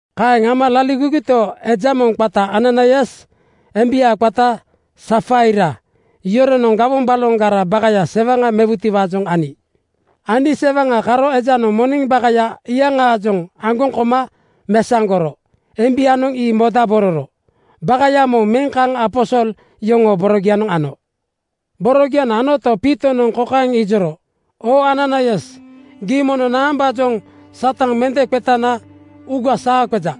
Kaeŋ ama laligogito, eja moŋ qata Ananaias embia qata Safaira yoronoŋ gawoŋ baloŋgaraa bakaya sewaŋa mewutiwaajoŋ ani. Ani sewaŋa karo ejanoŋ moneŋ bakaya iyaŋaajoŋ aŋgoŋ koma mesaŋgoro embianoŋ ii modabororo bakaya moŋ meŋ kaŋ aposol yoŋoo borogianoŋ ano. Borogianoŋ anoto, Piitonoŋ kokaeŋ ijoro, “Oo Ananaias, gii mono naambaajoŋ Satan mende qetana uuga saa qeja?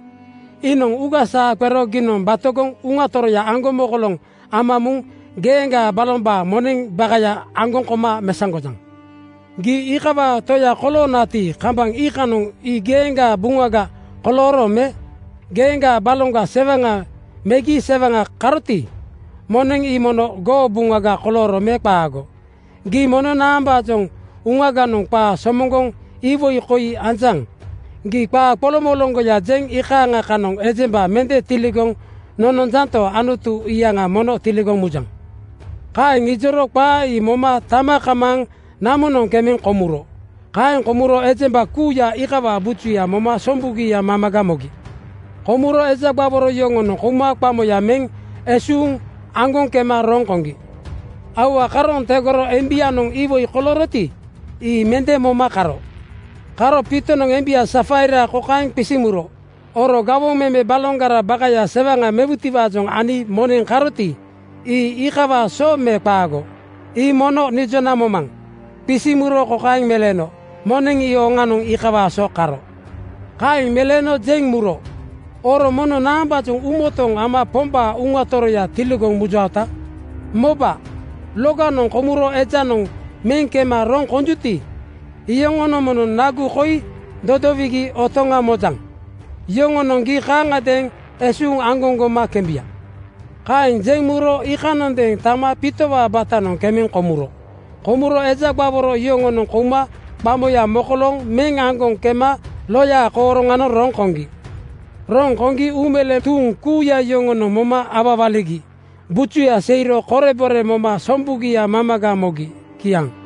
Iinoŋ uuga saa qero giinoŋ batogoŋ Uŋa Toroya aŋgomokoloŋ ama muŋ geeŋgaa balombaa moneŋ bakaya aŋgoŋ koma mesaŋgojaŋ? Gii iikawaa toya koloonati, kambaŋ iikanoŋ ii geeŋgaa buŋaga kolooro me? Geeŋgaa baloŋga sewaŋa megi sewaŋa karoti, moneŋ ii mono goo buŋaga kolooro me qaago? Gii mono naambaajoŋ uuganoŋ qaa somoŋgoŋ iwoi koi anjaŋ? Gii qaa qoloŋmoloŋgoya jeŋ iikaaŋa kanoŋ ejemba mende tiligoŋ nononjanto, Anutu iyaŋa mono tiligoŋ mujaŋ!” Kaeŋ ijoro qaa ii moma tama kamaaŋ namonoŋ kemeŋ komuro. Kaeŋ komuro ejemba kuuya iikawaa bujuya moma sombugia mamaga mogi. Komuro eja gbaworo yoŋonoŋ kouma qamoya meŋ esuuŋ aŋgoŋ kema roŋ koŋgi. Aua karooŋ tegoro embianoŋ iwoi kolooroti, ii mende moma karo. Karo Piitonoŋ embia Safaira kokaeŋ qisiŋ muro, “Oro gawoŋ meme baloŋgara bakaya sewaŋa mewutiwaajoŋ ani moneŋ karoti, ii iikawaa so me qaago? Ii mono nijona momaŋ!” Qisiŋ muro kokaeŋ meleeno, “Moneŋ ii oŋanoŋ iikawaa so karo.” Kaeŋ meleeno jeŋ muro, “Oro mono naambaajoŋ uumotooŋ ama Pombaa Uŋa Toroya tiligoŋ mujaota? Moba, loganoŋ komuro ejanoŋ meŋ kema roŋ konjuti, iyoŋonoŋ mono nagu koi dodowigi otoŋa mojaŋ. Yoŋonoŋ gii kaaŋagadeeŋ esuuŋ aŋgoŋ goma kembuya.” Kaeŋ jeŋ muro iikanondeeŋ tama Piitowaa batanoŋ kemeŋ komuro. Komuro eja gbaworo yoŋonoŋ kouma qamoya mokolooŋ meŋ aŋgoŋ kema loyaa kooroŋanoŋ roŋ koŋgi. Roŋ koŋgi uumeleeŋ tuuŋ kuuya yoŋonoŋ moma awawaligi bujuya seiro korebore moma sombugia mamaga mogi. Kiaŋ.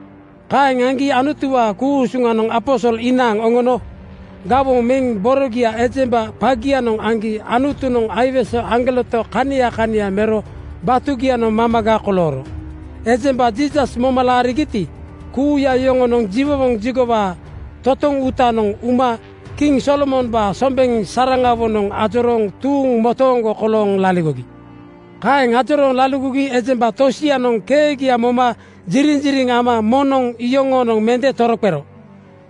Kaeŋ aŋgi Anutuwaa ku-usuŋanoŋ aposol inaaŋ oŋono gawoŋ meŋ borogia ejemba qagianoŋ aŋgi Anutunoŋ aiwese aŋgoleto kania kania mero batugianoŋ mamaga kolooro. Ejemba Jiisas moma laarigiti, kuuya iyoŋonoŋ jiwowoŋ jigowaa totoŋ uutanoŋ uma kiŋ Solomombaa sombeŋ saraŋawonoŋ ajorooŋ tuuŋ motooŋgo kolooŋ laligogi. Kaeŋ ajorooŋ laligogi ejemba tosianoŋ keegia moma jiriŋjiriŋ ama moŋnoŋ iyoŋoonoŋ mende toroqero.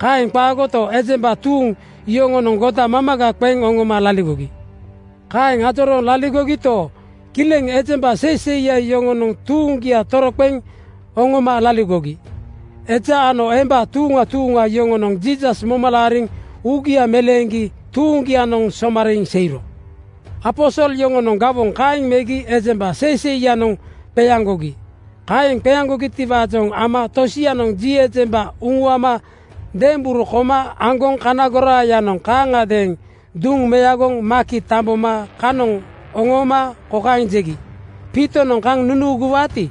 Kaeŋ qaagoto, ejemba tuuŋ yoŋonoŋ goda mamaga qeŋ oŋoma laligogi. Kaeŋ ajorooŋ laligogito, kileŋ ejemba seiseiya yoŋonoŋ tuuŋgia toroqeŋ oŋoma laligogi. Eja ano emba tuuŋa tuuŋa yoŋonoŋ Jiisas moma laariŋ uugia meleeŋgi tuuŋgianoŋ somariiŋ seiro. Aposol yoŋonoŋ gawoŋ kaeŋ megi ejemba seiseiyanoŋ qeaŋgogi. Kaeŋ qeaŋgogitiwaajoŋ ama tosianoŋ ji ejemba uŋuama demberu koma aŋgoŋ kana goraayanoŋ kaaŋagadeeŋ duŋ meagoŋ maki tamboma kanoŋ oŋooma kokaeŋ jegi, “Piitonoŋ kaŋ nunuuguwaati,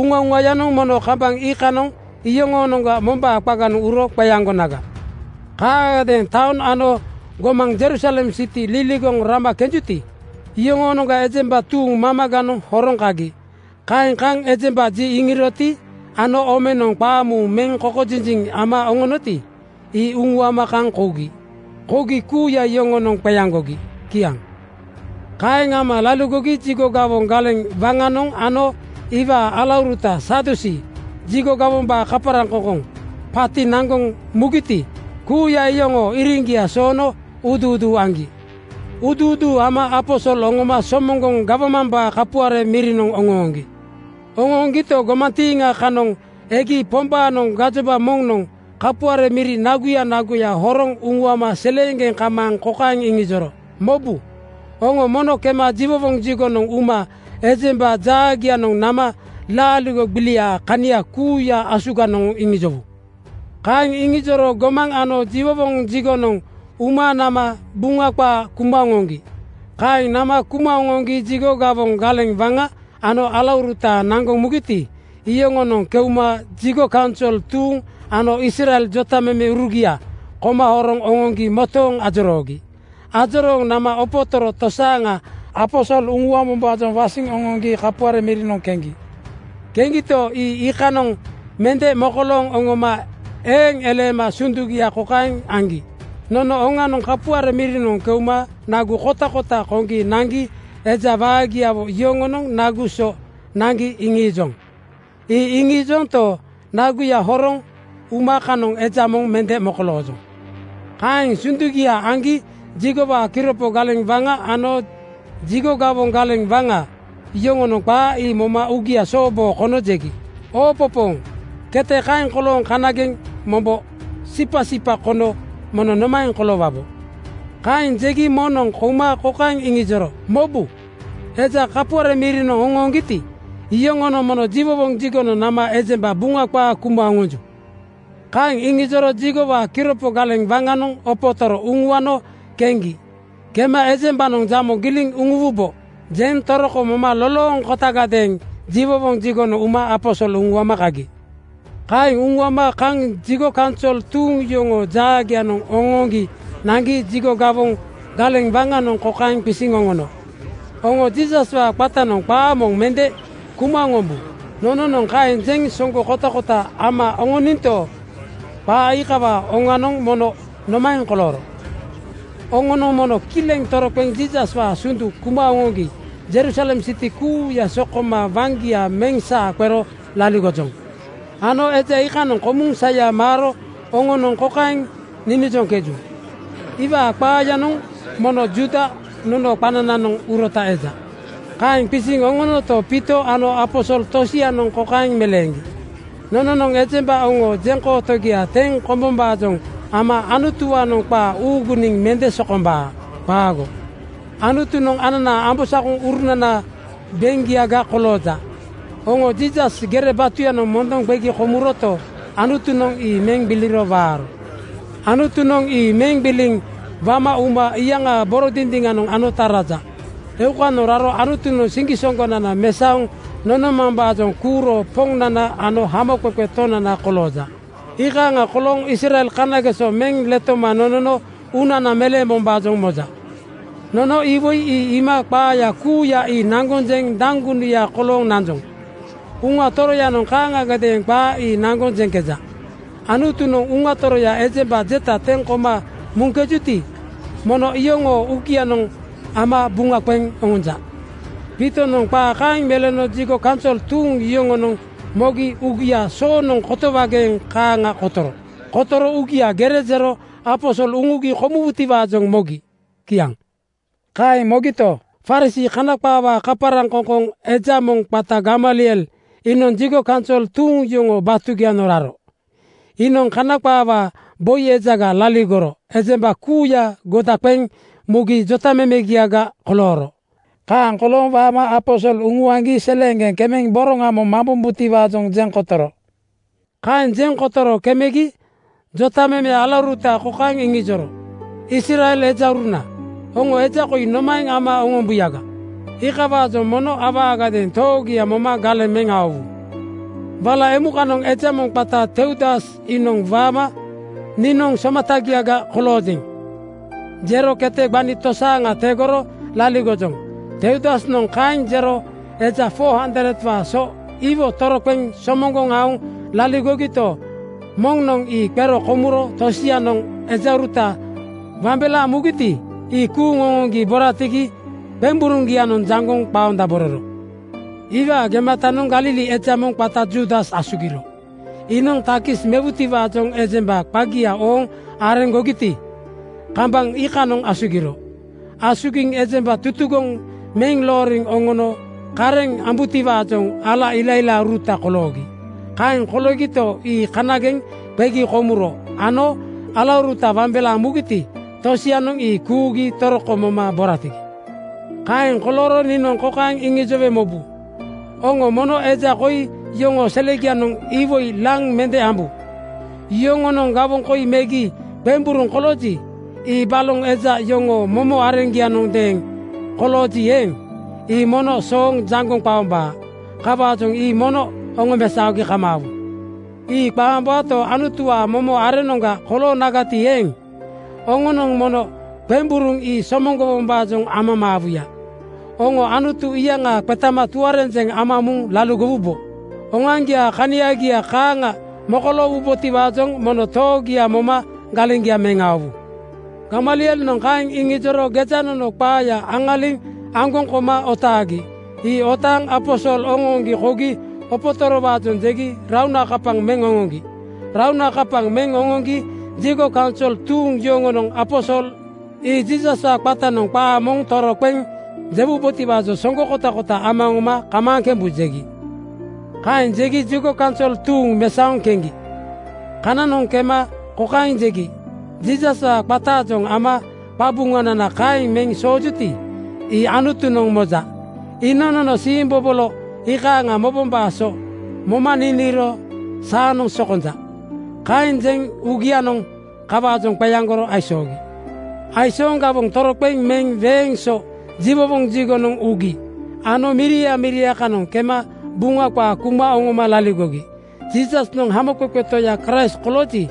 uŋauŋayanoŋ mono kambaŋ iikanoŋ yoŋoonoŋga mombaa qaganoŋ uro qeaŋgonaga.” Kaaŋagadeeŋ taoŋ ano gomaŋ Jerusalem siti liligoŋ rama kenjuti, iyoŋoonoŋga ejemba tuuŋ mamaganoŋ horoŋ kagi. Kaeŋ kaŋ ejemba ji iŋiroti ano omenoŋ qaamuuŋ meŋ kokojinjiŋ ama oŋoŋgiti, ii uŋuama kaŋ kougi. Kougi kuuya yoŋonoŋ qeaŋgogi. Kiaŋ. Kaeŋ ama laligogi jigo gawoŋ galeŋ waŋanoŋ ano iwaa alauruta Sadusii (Jigo gawombaa kaparaŋkoŋkoŋ) paati naŋgoŋ mugiti, kuuya iyoŋoo iriŋgia soono uuduuduu aŋgi. Uuduuduu ama aposol oŋoma somoŋgoŋ gawmambaa kapuare mirinoŋ oŋooŋgi. Oŋooŋgito, gomantiiŋa kanoŋ egi Pombaanoŋ gajoba moŋnoŋ kapuare miri naguya naguya horoŋ uŋuama seleeŋgeŋ kamaaŋ kokaeŋ iŋijoro, “Mobu, oŋo mono kema jiwowoŋ jigonoŋ uma ejemba jaagianoŋ nama laaligo gbiliaa kania kuuya asuganoŋ iŋijowu.” Kaeŋ iŋijoro gomaŋ ano jiwowoŋ jigonoŋ uma nama Buŋa qaa kuma oŋoŋgi. Kaeŋ nama kuma oŋoŋgi jigo gawoŋ galeŋ waŋa ano alauruta naŋgoŋ mugiti, iyoŋonoŋ keuma jigo kaunsol tuuŋ ano Israel jotamemeurugia koma horoŋ oŋoŋgi motooŋ ajoroogi. Ajorooŋ nama opotoro tosaaŋa aposol uŋuambombaajoŋ wasiŋ oŋoŋgi kapuare mirinoŋ keŋgi. Keŋgito, ii iikanoŋ mende mokolooŋ oŋoma eeŋ eleema sundugia kokaeŋ aŋgi, “Nono oŋanoŋ kapuare mirinoŋ keuma nagu kotakota koŋgi nangi eja waagiawo yoŋonoŋ nagu so naŋgi iŋiijoŋ. Ii iŋiijonto, naguya horoŋ uma kanoŋ eja moŋ mende mokoloojoŋ.” Kaeŋ sundugia aŋgi jigowaa kiropo galeŋ waŋa ano jigo gawoŋ galeŋ waŋa yoŋonoŋ qaa ii moma uugia sooboo kono jegi, “Oopopooŋ! Kete kaeŋ kolooŋ kanageŋ mombo sipasipa kono mono nomaeŋ koloowabo?” Kaeŋ jegi moŋnoŋ kouma kokaeŋ iŋijoro, “Mobu, eja kapuare mirinoŋ oŋooŋgiti, iyoŋonoŋ mono jiwowoŋ jigonoŋ nama ejemba Buŋa qaa kuma oŋonju!” Kaeŋ iŋijoro jigowaa kiropo galeŋ waŋanoŋ opotoro uŋuano keŋgi. Kema “Ejembanoŋ jamo giliŋ nunuwubo,” jeŋ toroko moma lolooŋkotagadeeŋ jiwowoŋ jigonoŋ uma aposol uŋuama kagi. Kaeŋ uŋuama kaŋ jigo kaunsol tuuŋ yoŋoo jaagianoŋ oŋooŋgi naŋgi jigo gawoŋ galeŋ waŋanoŋ kokaeŋ qisiŋ oŋono, “Oŋo Jiisaswaa qatanoŋ qaa moŋ mende kuma oŋombu. Nononoŋ kaeŋ jeŋ soŋgo kotakota ama oŋoninto, qaa iikawaa oŋanoŋ mono nomaeŋ kolooro? Oŋonoŋ mono kileŋ toroqeŋ Jiisaswaa sundu kuma oŋoŋgi Jerusalem siti kuuya sokoma waŋgia meŋ saa qero laligojoŋ. Ano eja iikanoŋ komuŋ saya maaro oŋonoŋ kokaeŋ ninijoŋkeju, ‘Iwaa qaayanoŋ mono Juuda nonoo qanananoŋ urota eja.’” Kaeŋ qisiŋ oŋonoto, Piito ano aposol tosianoŋ kokaeŋ meleeŋgi, “Nononoŋ ejemba oŋoo jeŋkootogia teŋ kombombaajoŋ ama Anutuwaanoŋ qaa uuguniŋ mende sokombaa. Qaago! Anutunoŋ ananaa ambosakoŋurunanaa beŋgiaga kolooja. Oŋo Jiisas gere batuyanoŋ mondoŋ qegi komuroto, Anutunoŋ ii meŋ gbiliro waaro. Anutunoŋ ii meŋ gbiliŋ wama uma iyaŋaa boro dindiŋanoŋ anota raja. Eukanoŋ raro Anutunoŋ siŋgisoŋgonana mesaoŋ nonomambaajoŋ kuuro Poŋnana ano Hamoqeqe Tonana kolooja. Iikaaŋa kolooŋ Israel kanageso meŋ letoma nonono uunana meleembombaajoŋ moja. Nono iwoi ii iima qaa kuuya ii naŋgoŋ jeŋ daŋgunuya kolooŋ nanjoŋ. Uŋa Toroyanoŋ kaaŋagadeeŋ qaa ii naŋgoŋ jeŋkeja. Anutunoŋ Uŋa Toroya ejemba jeta teŋ koma muŋkejuti, mono iyoŋoo uugianoŋ ama buŋa qeŋ oŋonja.” Piitonoŋ qaa kaeŋ meleeno jigo kaunsol tuuŋ yoŋonoŋ mogi uugia soonoŋ kotowageeŋ kaaŋa kotoro. Kotoro uugia gere jero aposol uŋugi komuwutiwaajoŋ mogi. Kiaŋ. Kaeŋ mogito, Farisii (Kana qaawaa kaparaŋkoŋkoŋ) eja moŋ qata Gamaliel iinoŋ jigo kaunsol tuuŋ yoŋoo batugianoŋ raro. Iinoŋ Kana qaawaa boi ejaga laligoro ejemba kuuya goda qeŋ mugi jotamemegiaga kolooro. Kaaŋ kolooŋ waama aposol uŋuaŋgi seleeŋgeŋ kemeŋ boroŋa moŋ mambombutiwaajoŋ jeŋ kotoro. Kaeŋ jeŋ kotoro kemegi jotameme alauruta kokaeŋ iŋijoro, “Israel ejauruna, oŋo eja koi nomaeŋ ama oŋombuyaga, iikawaajoŋ mono awaagadeeŋ toogia moma galeŋ meŋ aowu. Wala emukanoŋ eja moŋ qata Teudas iinoŋ waama ‘Niinoŋ somatagiaga koloojeŋ,’ jero kete gbani tosaaŋa tegoro laligojoŋ. Teudasnoŋ kaeŋ jero eja 400:waa so iwo toroqeŋ somoŋgoŋ aoŋ laligogito, moŋnoŋ ii qero komuro tosianoŋ ejauruta wambelaaŋ mugiti, ii kuuŋ oŋoŋgi boratigi qemburuŋgianoŋ jaŋgoŋ qaondabororo. “Iwaa gematanoŋ Galili eja moŋ qata Juudas asugiro. Iinoŋ takis mewutiwaajoŋ ejemba qagia ooŋ areŋgogiti, (sensus) kambaŋ iikanoŋ asugiro. Asugiŋ ejemba tutugoŋ meŋ looriŋ oŋono kareŋ ambutiwaajoŋ ala ilailaauruta koloogi. Kaeŋ koloogito, ii kaaŋagadeeŋ qegi komuro ano alauruta wambelaaŋ mugiti, tosianoŋ ii kuugi toroko moma boratigi. Kaeŋ kolooro niinoŋ kokaeŋ iŋijowe mobu: Oŋo mono eja koi yoŋoo selegianoŋ iwoi laŋ mende ambu. Yoŋonoŋ gawoŋ koi megi qemburuŋ kolooji, ii baloŋ ejemba yoŋoo momo areŋgianondeeŋ kolooji eeŋ, ii mono sooŋ jaŋgoŋ qaombaa. Kawaajoŋ ii mono oŋomesaogi kamaawu. Ii qaombaato, Anutuwaa momo areŋnoŋga koloonagati eeŋ, oŋonoŋ mono qemburuŋ ii somoŋgowombaajoŋ amamaawuya. Oŋo Anutu iyaŋa qetama tuarenjeŋ ama muŋ laligowubo. Oŋoaŋgiaa kaniagia kaaŋa mokoloowubotiwaajoŋ mono toogia moma galeŋgia meŋ aowu.” Gamalielnoŋ kaeŋ iŋijoro gejanono qaaya aŋaliŋ aŋgoŋ koma otaagi. Ii otaaŋ aposol oŋooŋgi kougi opotorowaajoŋ jegi raunakapaŋ meŋ oŋoŋgi. Raunakapaŋ meŋ oŋoŋgi jigo kaunsol tuuŋ yoŋonoŋ aposol ii Jiisaswaa qatanoŋ qaa moŋ toroqeŋ jewubotiwaa soŋgo kotakota ama oŋoma “Kamaaŋ kembu,” jegi. Kaeŋ jegi jigo kaunsol tuuŋ mesaoŋ keŋgi. Kananoŋ kema kokaeŋ jegi, “Jiisaswaa qataajoŋ ama qabuŋanana kaeŋ meŋ soojuti, ii Anutunoŋ moja. Iinoŋ nono siimbobolo iikaaŋa mobombaa so moma niniiro saanoŋ sokonja.” Kaeŋ jeŋ uugianoŋ kawaajoŋ qeaŋgoro aisoogi. Aisooŋ gawoŋ toroqeŋ meŋ weeŋ so jiwowoŋ jigonoŋ ugi ano miria miria kanoŋ kema Buŋa qaa kuma oŋoma laligogi. Jiisasnoŋ Hamoqeqe Toya Kraist kolooji,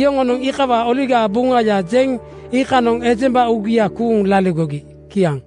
yoŋonoŋ iikawaa Oligaa Buŋaya jeŋ iikanoŋ ejemba uugia kuuŋ laligogi. Kiaŋ.